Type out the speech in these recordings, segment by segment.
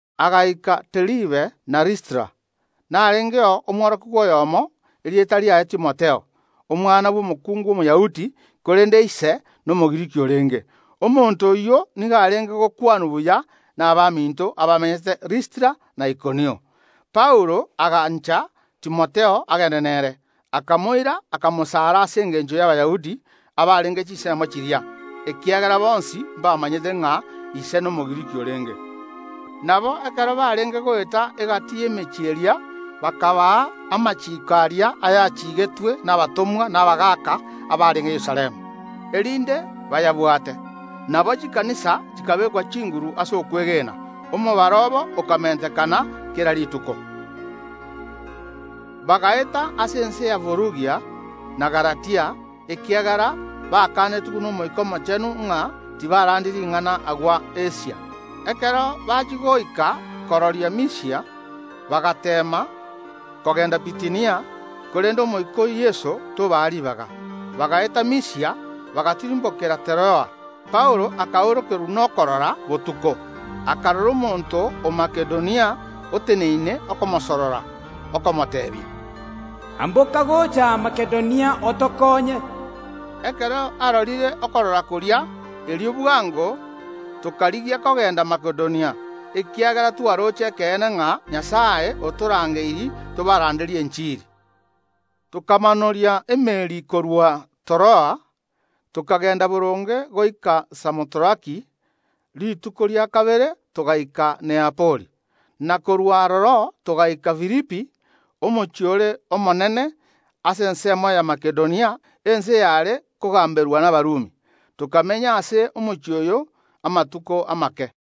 Agaika Deribe na Listra, ase omworokigwa oyomo amenyete, erieta riaye Timotheo, omwana bw’omokuungu Omoyahudi, korende ise n’Omogiriki orenge. Omonto oyio nigo arenge gokwanwa buya nabaminto abamenyete Listra na Ikonio. Paulo agancha Timotheo agende nere, erio akamoira, akamwarokia ase engencho y’Abayahudi abarenge chinsemo chiria, ekiagera bonsi mbamanyete ng’a ise n’Omogiriki orenge. Nabo, ekero barenge goeta egati y’emechie eria, bakabaa amachiiko aria achiigetwe nabatomwa n’abagaaka abarenge Yerusalemu, erinde bayabwate. Nabo, Chikanisa chikabekwa chinguru ase okwegena; omobaro obo okamentekana kera rituko. Paulo na Timotheo bagaeta ase ense ya Furugia na Galatia, ekiagera bakanetigwe n’Omoika Omochenu ng’a tibarandia ring’ana agwo ase ense y’Asia. Ekero bachia goika chimbebe chi’ense ya Misia, bagateema kogenda Bitinia, korende Omoika o Yeso tobaa ribaga; ase igo, bagaeta ime ya Misia, bagatirimbokera gochia Teroa. Ase obotuko Paulo akaorokerwa n’endoto, akarora omonto o Makedonia oteneine okomosorora, okomoteebia: “Koranche, amboka gocha aa Makedonia otokoonye.” Magega y’okorora koria, erio bwango kegima tokarigia kogenda Makedonia, ekiagera twaroche ekeene ng’a Nyasae otorangeirie tobaranderie enchiri. Tokamanoria emeeri korwa Teroa, tokagenda boronge goika Samotraki. Rituko rikobwatia togaika Neapoli, na korwa aroro togaika Filipi, omochie ore omonene ase ensemo ya Makedonia, ense yare kogamberwa n’Abarumi. Tokamenya ase omochie oyo amatuko amake.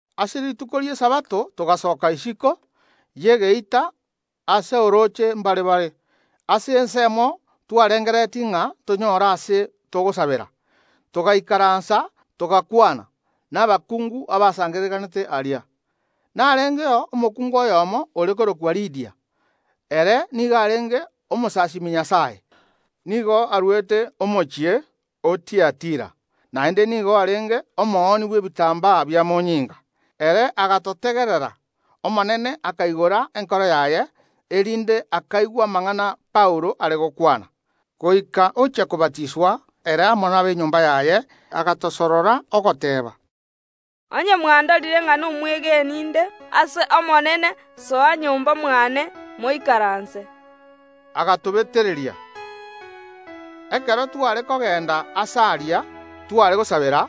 Ase rituko ria Esabato togasoka isiko y’egeita ase orooche mbarabare, ase ensemo twarengereretie ng’a tonyore aase togosabera. Togaikaransa, togakwana nabakungu abasangererekanete aria. Narengeo omokungu oyomo ore korokwa Lidia; ere nigo arenge omosasiimi Nyasae. Nigo arwete omochie o Tiatira; naende nigo arenge omoonia bw’ebitambaa bimonyinga. Omokungu oyo nigo arenge omosasiima o Nyasae. Ere agatotegerera. Omonene akaigora enkoro y’omokuungu oria, erinde akaigwa na gwancha amang’ana Paulo arenge gokwana. Goika omokungu oria ochia kobatiswa, ere amo nab’enyomba yaye, agatosorora na gotobetereria ogoteeba: “Onye mwandorire ng’a n’omwegeni nde ase Omonene, soa nyomba mwane, moikaranse.” Riruko erimo, ekero tware kogenda aase aria tware gosabera,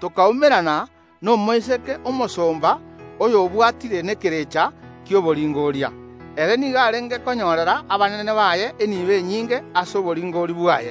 tokaumerana n’omoiseke omosomba oyobwatire n’ekerecha ki’oboringoria. Omoiseke oyio nigo arenge konyorera abanene baye enibo enyinge ase oboringoria bwaye.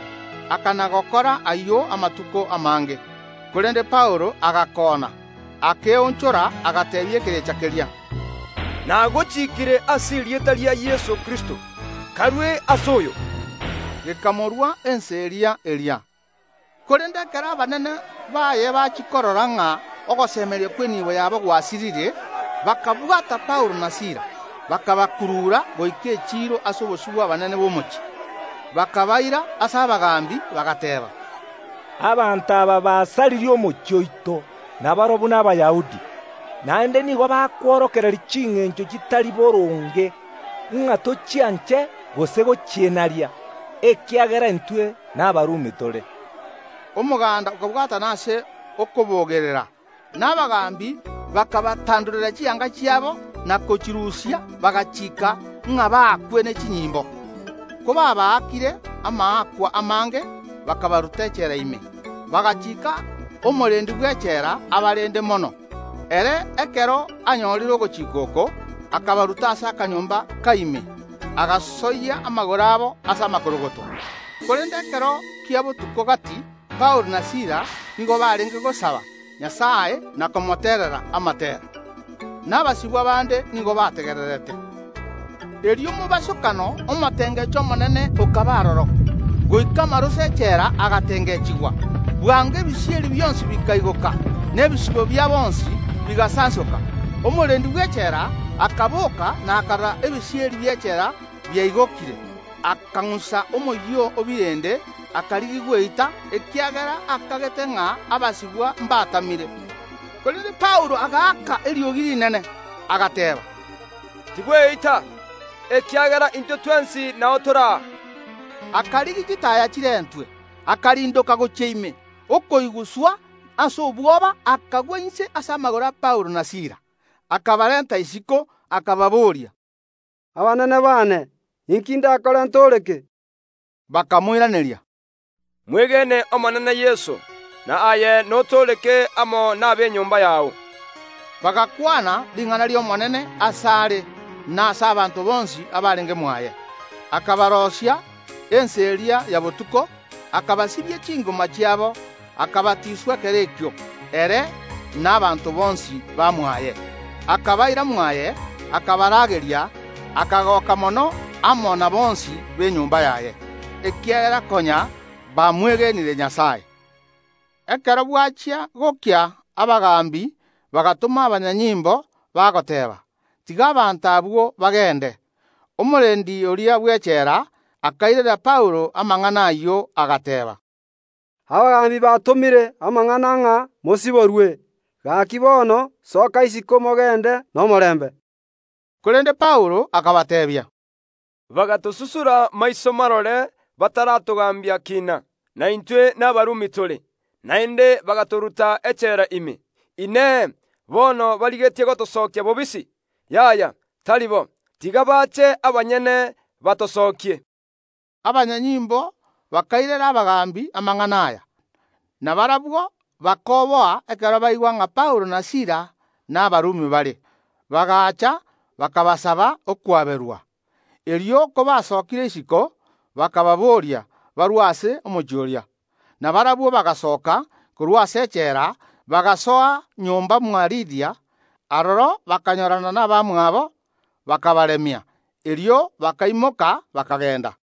Akana‐gokora ayio amatuko amange. Korende Paulo agakoona, akeonchora, agateebia ekerecha keria: “Nagochikiire ase erieta ria Yeso Kristo. Karue ase omoiseke oyo!” Gekamorua ensa eria eria. Korende ekero abanene baye bachia korora ng’a ogosemeria kw’enibo yabo gwasirire, bakabwata Paulo na Sila, bakabakurura goika echiiro ase obosio bw’abanene b’omochie. Bakabaira ase abagaambi, bagateeba: “Abanto aba basaririe omochie oito, na barabwo n’Abayahudi. Naende nigo bakworokereria chingencho chitari boronge ng’a tochianche gose gochienaria, ekiagera intwe n’Abarumi tore.” Omoganda okabwatana ase okobogerera, na abagaambi bakabatandorera chianga chiabo na gochirusia, bagachiika ng’a baakwe ne chinyimbo. Kobabaakire amaakwa amange, bakabaruta echela ime, bagachiika omorendi bw’echela abarende mono. Ere ekero anyorire ogochika oko akabaruta ase akanyomba ka ime, agasoyia amagoro abo ase amakorogoto. Korende ekero kia botuko gati Paulo na Sila nigo barenge gosaba Nyasae na komoterera amatera, na abasibwa bande nigo babategererete. Erio mobosokano omotengecho omonene okaba aroro, goika amaroso ’echela agatengechigwa; bwango ebisieri bionsi bikaigoka, na ebisibo bia bonsi bigasansoka. Omorendi bw’echela akaboka na akarora ebisieri bi’echela biaigokire, akang’usa omoyio o birende, akarigia gweita, ekiagera akagete ng’a abasibwa mbatamire. Korende Paulo agaaka eriogi rinene, agateeba: “Tibweita, ekiagera intwe twensi nao tore aa.” Akarigia chitaaya chirentwe, akarindoka gochia ime, okoiguswa ase obwoba, akagwa inse ase amagoro a Paulo na Sila; akabarenta isiko, akababoria: “Abaanene baane, inki ndakore ntooreke?” Bakamoiraneria: “Mwegene Omonene Yeso, na aye notooreke amo nab’enyomba yao.” Bagakwana ring’ana ri’Omonene asare na ase abanto bonsi abarenge mwaye. Akabaroisia ensa eria ya botuko, akabasibia chingoma chiabo, akabatiswa ekero ekio, ere na abanto bonsi ba mwaye. Akabaira mwaye, akabarageria, akagoka mono amo na bonsi b’enyomba yaye, ekiagera konya bamwegenire Nyasae. Ekero bwachia gokia, abagaambi bagatoma abanyanyimbo, bagoteeba: “Tiga abanto abwo bagende!” Omorendi oria bw’echela akairera Paulo amang’ana ayio, agateeba: “Abagaambi batomire amang’ana ng’a mosiborwe; gaki bono, soka isiko, mogende nomorembe!” Korende Paulo akabateebia: “Bagatosusura maiso marore bataratogambia kina, na intwe n’Abarumi tore, naende bagatoruta echela ime. Inee! Bono barigetie gotosokia bobisi? Yaya! Tari bo; tiga baache abanyene batosokie.” Abanyanyimbo bakairera abagaambi amang’ana aya, na barabwo bakoboa ekero baigwa ng’a Paulo na Sila n’Abarumi bare. Bagaacha bakabasaba okwaberwa. Erio kobaabasokirie isiko bakababoria barue ase omochie oria. Na barabwo bagasooka korwa ase echela, bagasoa nyomba mwa Lidia. Aroro bakanyorana nabamwabo, bakabaremia. Erio bakaimoka, bakagenda.